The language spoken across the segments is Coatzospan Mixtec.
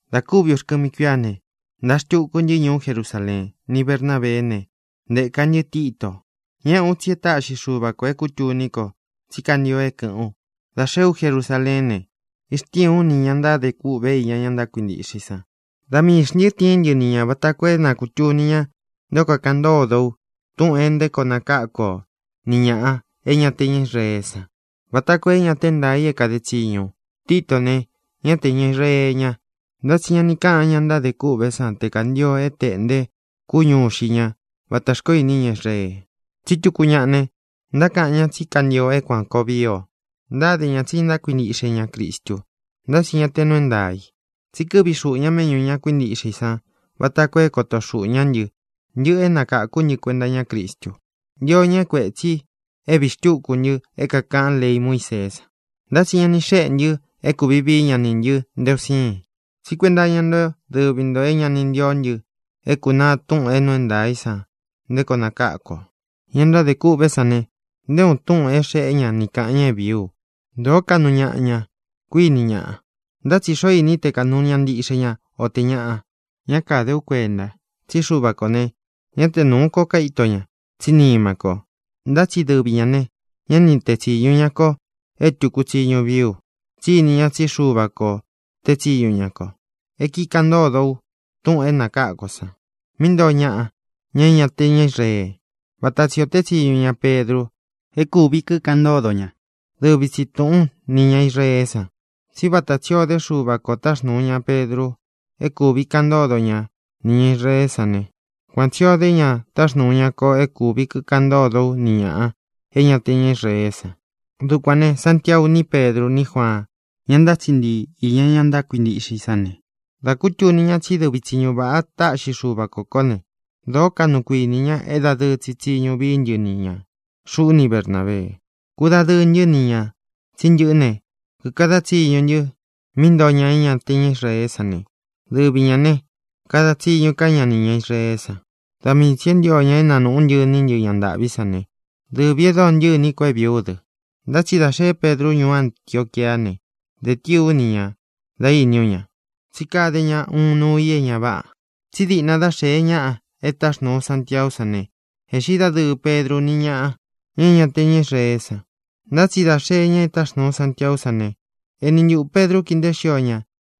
Dā kúvi uxkɨmi kuíá ne, ntāa xtuku ntɨ́ ñuú Jerusaleen ni Bernábeé ne, ntēka ntɨ́ Tito. Ñéꞌē ú, tsi e táꞌxi Xuva kō é kūtuní ko tsí kantio é kɨ̄ꞌɨ́n u. Dā xeé u Jerusaleén ne, ixtíīn ú nī ña ntádē kûꞌve iña ña kuíntiꞌxe i san. Da miī xntɨ́ tiín ntɨ ni ñā vata koo é na kūtuni ña nté o kakaꞌan ntódo u túꞌūn nté koo nakáku o ni ñāꞌa é ña te ña Israeé san, vata koo é ñā te é ntaā i é kāde tsiñu u. Titó ne, ñá te ñā Israee ña, ntá tsi ña ni káꞌan ña ntádē kûꞌvé san te kantio é tēꞌnte kúñu ixi ña vata xkoó ini ñá Israee. Tsí tuku ñaꞌa ne, ntákaꞌan ña tsí kantio é kuān koo vii o. Ntáde ña tsi ntákuintiꞌxe ña Cristu, ntá tsi ñá tē nuu é ntaā i. Tsi kɨ́ꞌvi xūꞌu ña méꞌñū ña kuíntiꞌxe i san vata koo é koto xuꞌū ñá ntɨ, ntɨꞌɨ é nakáku ntɨ́ kuenta iñá Cristu. Ntio ña é kuētsi é vīí xtuku ntɨ́ é kākaꞌán lei Muíseé san. Ntá tsi ña ni xéꞌe ntɨ é kūvi vií ña nī ntɨ nté un siin, tsí kuenta iña dɨví nto é ña ni ntíó ntɨ é kūnaa túꞌūn é nuu é ntaā í san nté koo nakáku o. Ña ntádē kûꞌvé san ne, nté uun túꞌūn é xēe ña ni káꞌan ña é vīí u. Dōó kaꞌnu ñaꞌa ña, kuiní ñaꞌa, ntá tsi ¿xoo iní i te kāꞌnu ñaꞌa ntiꞌxe ña, o tē ñaꞌa? Ñá kāde ú kuenta, tsí Xuva kō ne, ñá te nūú ko kaíto ña, tsí nima ko. Ntá tsi dɨvi ñā ne, ñá ni tee tsīñu ña ko é tūku tsiñu vií u, tsí ini ña tsí Xuva kō tée tsiñu ña ko é kikaꞌan ntódo u túꞌūn é nakáku ō san, míꞌī ntoo ñaꞌa, ña é ña te ña Israee, váta tsi ō tée tsiñu ña Pedru é kāꞌan ntódo ña dɨvi tsi tūꞌún nī ña Israeé san. Tsí vata tsī o dé Xuva kō táxnūu ña Pedru é kūvi kikaꞌan ntódo ña nī ña Israeé san ne, kuan tsī o dé ña táxnūu ña ko é kūvi kikaꞌan ntódo ú ni ñāꞌa é ña te ña Israeé san. Dukuān ne, Santiau ní Pedru ní Juaan, ña ntátsiꞌi ntii īña ña ntákuintiꞌxe i sán ne, dā kutuni ña tsí dɨvi tsiñu vāꞌa táꞌxi Xuva kō kó ne, dōó kaꞌnu kuinī ña é dadɨɨ tsi tsiñu vií ntɨ ni ñā, xuꞌú ni Bernābee. Kūdadɨɨ ntɨ́ ni ñā tsí ntɨꞌɨ́ ne, kīkada tsiñu ntɨ mí ntoo ña é ña te ña Israeé san ne, dɨvi ñā ne, kada tsiñu ká ña nī ña Israeé san. Da mii tsī é ntio ña é nanūꞌú ntɨ iní ntɨ ña ntāꞌví san ne, dɨvī e dóo ntɨꞌɨ iní ko é vīí u dɨ. Ntá tsi dā xée Pedru ñuú Antioquiá ne, dē tíī ú ni ña dā íni ú ña, tsí kade ña uun nuu i é ñā váꞌā. Tsí diꞌna dá xēe ñáꞌa e táxnūu Santiaú san ne, ēꞌxí dadɨɨ Pedru ni ñáꞌa, ña é ña te ña Israeé san. Ntá tsi dā xee ñáꞌa e táxnūu Santiaú san ne, eni ntuꞌū Pedru kíi nteé xio ña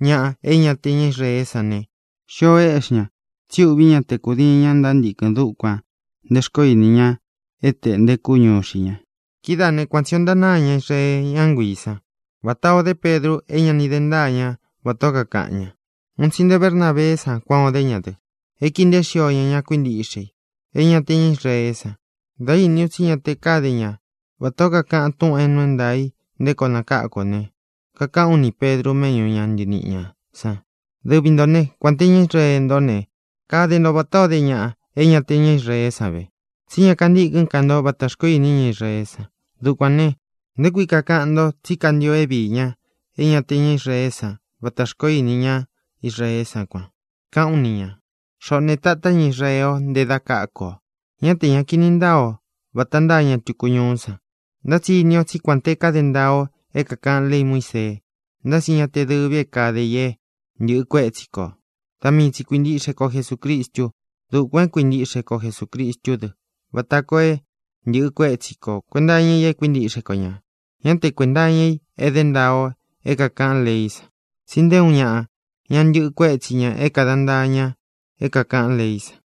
ñaꞌa é ña te ña Israeé san ne, xio éꞌxi ña, tsi úꞌvī ñá te kūdiin ña ntántikɨn dukuān nté xkoó ini ña é tēꞌnte kúñu ixi ña. Kidáā né, kuan tsī o ntánāa ña Israee, ñá nguiī sán, vatā o dé Pedru é ña ni de ntáa ña vatā ó kakaꞌan ña. Un tsi nté Bernabeé san kuān o dé ña dɨ, é kīi nteé xio ña ña kuíntiꞌxe i, ña é ña te ña Israeé san. Dā íni u tsí ña te káde ña vatā ó kakaꞌan túꞌūn é nuu é ntaā i nté koo nakáku ō ne, kakaꞌán u nī Pedru méꞌñu ūn ntɨɨ́ ntɨ̄ɨ́ ñaꞌa san: “Dɨvi ntō né, kuān te ñá Israee ntó ne, kade nto vatā ó de ña é ña te ña Israeé san ve, tsí ña kantîkɨ́n ka nto vata xkoó ini ñá Israeé san. Dukuān ne, ¿nté kui kakaꞌan nto tsí kantio é vīí ña é ña te ña Israeé san vata xkoó ini ñá Israeé san kuan?”, kaꞌán u ni ñā. Xoꞌō ne, tatá ña Israee o nte da káku ō, ñá te ña kīni ntáa o vāta ntáa ña tuku ñuú san. Ntá tsi ini o tsí kuān te káde ntaa o é kākaꞌán lei Muísee, ntá tsi ña te dɨ́vī é kade i é ntɨꞌɨ kuétsi kō. Da mii tsi kuintiꞌxe ko Jesūcristu. Dukuān é kuintiꞌxe ko Jesūcristú dɨ vata koo é ntɨ̄ꞌɨ kuétsi ko kuēnta iña i e kuíntiꞌxe kō ña, ñá te kuēnta iña i é dé ntaa o é kākaꞌán leí san, tsi nté uun ñaꞌa ña ntɨꞌɨ kuétsi ña é kāda ntaa ña é kākaꞌán leí san.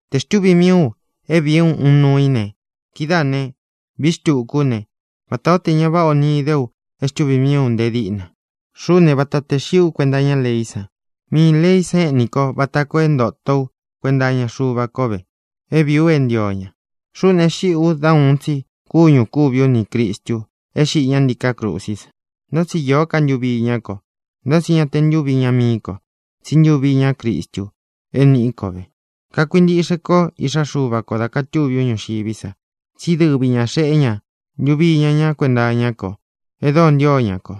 Te xtuvī mii u é vīí u uun nuu í ne, kidáā ne, vií xtuku ú ne, vatā ó tē ña váꞌa o ni īde u é xtuvī mií u nte díꞌna. Xuꞌú ne, vata tē xiꞌí u kuenta iñá leí san. Miī leí san éꞌni ko vata koo é ntōto ú kuenta iña Xuva ko ve é vīí u é ntio ña. Xuꞌú ne, e xíꞌī u dá uun tsi kúñū kúvi ú nī Cristu é xiꞌi ñá ntiká krusí san, ntá tsi īó ka ntuvi iñá ko. Ntá tsi ñá te ntūvi iña mií ko, tsí ntuvi iñá Cristu é nīꞌí ko ve. Kakuintiꞌxe kó Iꞌxá Xuva kō dá kātuví u ñuxiví sa, tsí dɨvi ñā xeꞌé ña ntuvi iña ñá kuenta iñá ko e dóo ntio ña ko.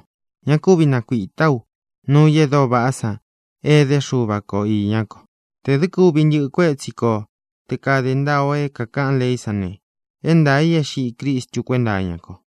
Ña kúvi nakuītá u nuu i e dóo vaꞌá san é edé Xuva ko īñá ko. Tē dɨ́ kuvi ntɨꞌɨ kuétsi ko te kāde ntaa o é kākaꞌán leí san ne, é ntaā i é xiꞌí Cristu kuénta iña ko.